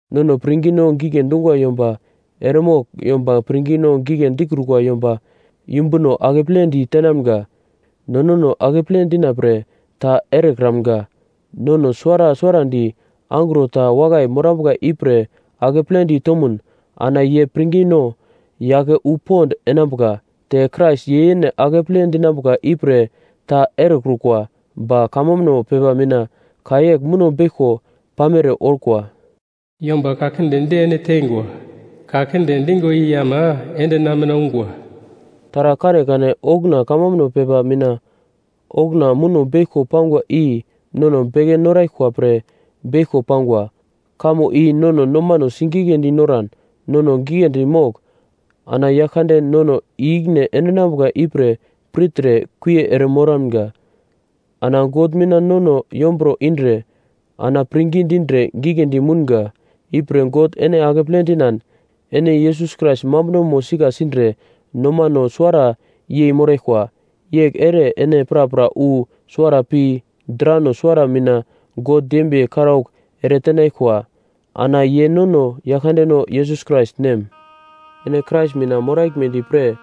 Nono pirngino gigle dungwa yomba eremogl yomba pirngino gigle dikrukwa yomba yumbuno akepledi tenamga. No nono akeple dina pre ta erekramga. Nono suwara suwarandi angro ta wakai morambuka ipre akepledi tomun ana ye pirngino yake wu pond enambuka. Te Krais ye yene akeple dinambuka ipre ta erekrukwa, ba kamambuno pepa mina ka yegl muno beglko pamere orkwa: “Yomba ka kinde di ene tengwa, ka kinde dingwa i ama ende na mina ungwa.” Taragl kanekane okuna kamambuno pepa mina okuna muno beglko pangwa i nono beke noraglkwa pre beglko pangwa. Kamo i nono nomano sigigledi noran nono giglendi mogl ana Yaglkande nono i-ikine endinambuka ipre pirtre kuie ere moramga. Ana God mina nono yomburo indre ana pirngi dindre giglendi mounga. Ipre God ene akeple dinan ene Yesus Krais mambunomo sika sindre nomano suwara yei moraglkwa. Yegl ere ene prapra wu suwara pi drano suwara mina God dembiye karaugl eretenaglkwa ana ye nono Yaglkandeno Yesus Krais Nem. Ene Krais mina moraglmedi pre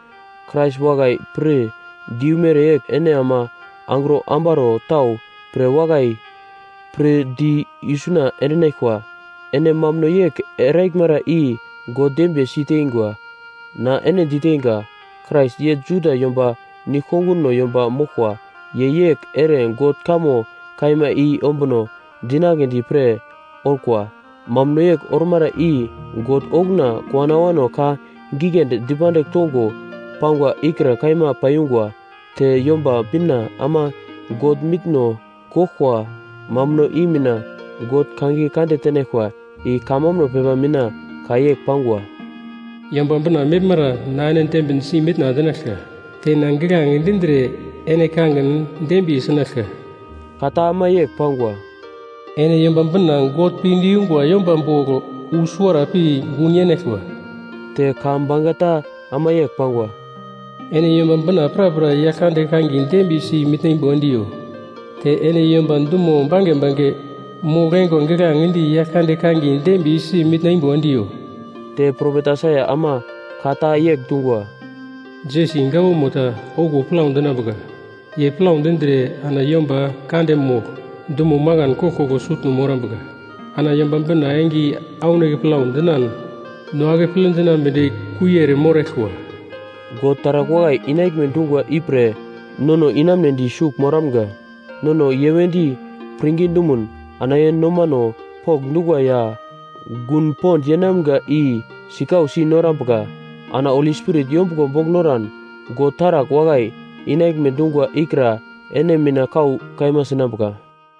Krais wakai pir di yu mereyegl ene ama angro ambaro tau pre wakai pir di isuna endinaglkwa. Ene mambuno yegl eraglmara i God dembiye si teingwa. Na ene diteinga, Krais ye Juda yomba nigl-konguno yomba moglkwa. Ye yegl ere God kamo kaima i ombuno dinagledi pre orkwa. Mambuno yegl ormara i God okuna kowano awano ka giglendi dipandigl tongo pangwa ikra kaima paiyungwa. Te Yomba Bina ama God mitno goglkwa mambuno i mina God kangiye kande tenaglkwa, i kamambuno pepa mina ka yegl pangwa: “Ipre Yomba Bina meglmara na ene dembinsi mitna endinaglka, te na giglange dindre ene kangin dembiye sinaglka.” Ka ta ama yegl pangwa, “Ene Yomba Bina God pinde yungwa yomba bogl wu suwara pi gun yenaglkwa!” Te ka bangeta ama yegl pangwa, “Ene Yomba Bina prapra Yaglkande kangiye dembiyesi mitna imbo endiyo! Te ene yomba dumo bange bange mogl-eingwa giglange di Yaglkande kangiye dembiyesi mitna imbo endigo!” Te propet Aisaia ama ka ta yegl dungwa, “Jesi gawamo ta okuwo plau dinambuka, ye plau dindre ana yomba kande mogl dumo makan koglkoglo sutno morambuka, ana Yomba Bina enge i aunake plau dinan no akeple dinambedi kuie ere moraglkwa.” God taragl wakai inaglme dungwa ipre nono inamunedi sugl moramga. Nono ye wedi pirngi dumun ana ye nomano pokndungwa ya gun pond yeinamga i sikausi norambuka. Ana Holi Spirit yombuglo bogl noran, God taragl wakai inaglme dungwa ikra ene mina kau kaima sinambuka.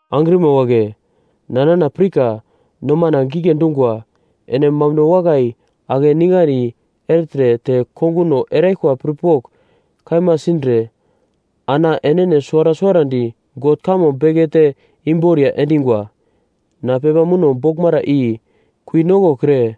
Angrima wagle, na nana pirka nomana gigle dungwa. Ene mambuno wakai akeningandi ertre te konguno eraglkwa pirpogl kaima sindre ana enene suwara suwarandi God kamo bekete imboriya endingwa. Na pepa muno boglmara i kui nokokre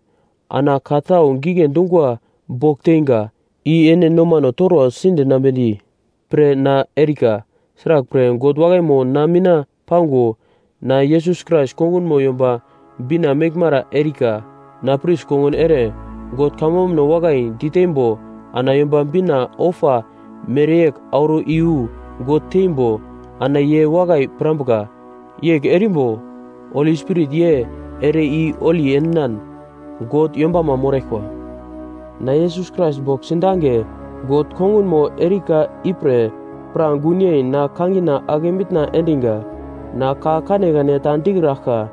ana ka tau gigle dungwa bogl teinga, i ene nomano torwa sidinambedi pre na erika. Sraglpre, God wakaimo na mina pango: Na Yesus Krais kongunmo Yomba Bina meglmara erika. Na pris kongun ere God kamambuno wakai diteimbo ana Yomba Bina ofa mereyegl auro iyu God teimbo ana ye wakai pirambuka. Yegl erimbo Holi Spirit ye ere i holi endinan God yombama moraglkwa. Na Yesus Krais bogl sidange God kongunmo erika ipre pra gun yei na kangina ake mitna endiga. Na ka kanekane ta dikraglka,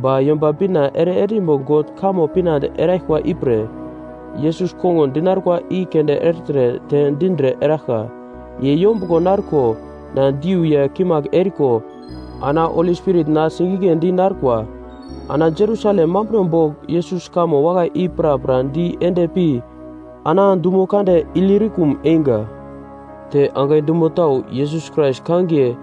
ba Yomba Bina ere endimbo God kamo pinande eraglkwa ipre Yesus kongun dinarkwa i keunde ertre te dindre eraglka. Ye yombuglo narko na diu ya kimagl eriko ana Holi Spirit na sigigledi narkwa. Ana Jerusalem mambuno bogl Yesus kamo wakai i prapra di ende pi ana dumo kande Ilirikum einga. Te angai dumo tau Yesus Krais kangiye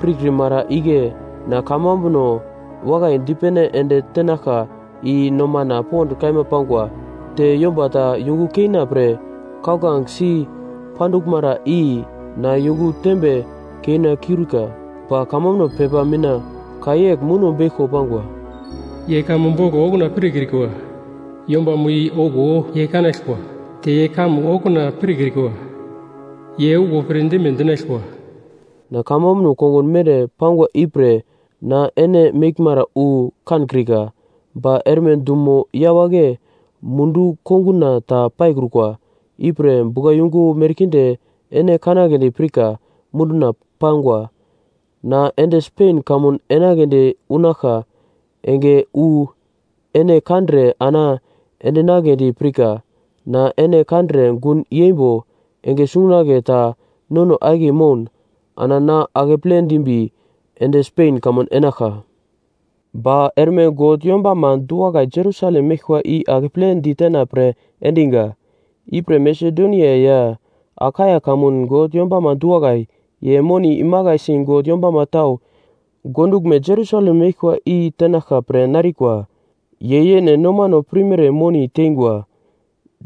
pirkrimara igle na kamambuno wakai dipene ende tenaglka i nomana pond kaima pangwa, te yomba ta yungu keina pre kauglange si panduglmara i na yungu tembe keina kiurika. Ba kamambuno pepa mina ka yegl muno beglko pangwa: “Ye kamo bogl okuna pirkrikwa, yombamo i okuwo ye kanaglkwa, te ye kamo okuna pirkrikwa, ye okuwo pirdime dinaglkwa.” Na kamambuno kongun mere pangwa ipre na ene meglmara wu kankrika. Ba erme dumo yawagle mundu konguna ta paikrukwa, ipre buglayungu merkinde ene kanagledi pirka munduna pangwa. Na ende Spen kamun enagledi unaglka enge wu ene kandre ana endinagledi pirka. Na ene kandre gun yeimbo, enge sungunagle ta nono akiye moun ana na akeple dimbi ende Spen kamun enaglka. Ba erme God yombama du-wakai Jerusalem meglkwa i akeple ditena pre endiga. Ipre Masedonia ya Akaia kamun God yombama du-wakai, ye moni imakaisi God yombama tau gonduglme Jerusalem meglkwa i tenaglka pre narikwa. Ye yene nomano pirmere moni tengwa.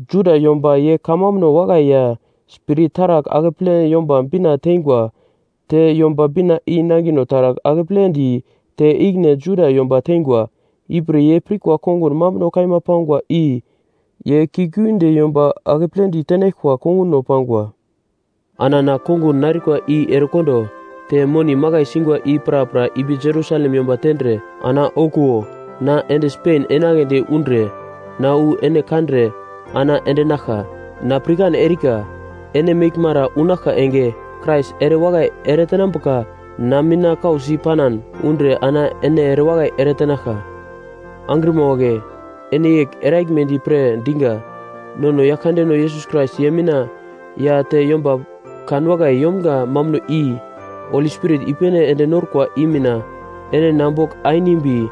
Juda yomba ye kamambuno wakai ya Spirit taragl akepledi Yomba Bina teingwa; te Yomba Bina i nangino taragl akepledi te ikine Juda yomba teingwa. Ipre ye pirkwa kongun mambuno kaima pangwa i, ye kiuglgiunde yomba akeple ditenaglkwa konguno pangwa. Ana na kongun narkwa i erekondo, te moni makai singwa i prapra ipi Jerusalem yomba tendre ana okuwo na ende Spen enagledi undre, na wu ene kandre ana endenaglka. Na pirkan erika, ene meglmara unaglka enge, Krais ere wakai eretenambuka na mina kausi panan undre ana ene erewakai eretenaglka. Angrima wagle, ene yegl eraglmedi pre diga: Nono Yaglkandeno Yesus Krais ye mina ya te yomba kanwakai yomga mambuno i Holi Spirit i-pene ende norkwa i mina, ene na bogl ainimbi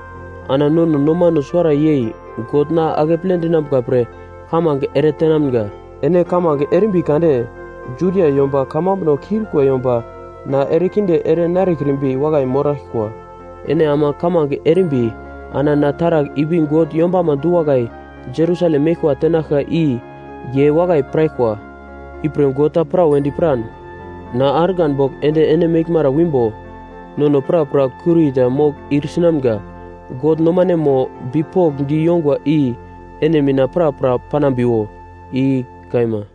ana nono nomano suwara yei God na akeple dinambuka pre kamange eretenamga. Ene kamange erimbi kade Judia yomba kamambuno kiurikwa yomba na erekinde ere narekrimbi wakai moraglkwa. Ene ama kamange erimbi ana na taragl ipi God yombama du-wakai Jerusalem meglkwa tenaglka i ye wakai piraglkwa. Ipre God ta prawedi piran na argan bogl ende ene meglmara wimbo nono prapra kurita mogl ir sinamga. God nomanemo bipokndi yongwa i ene mina prapra panambiwo. I kaima.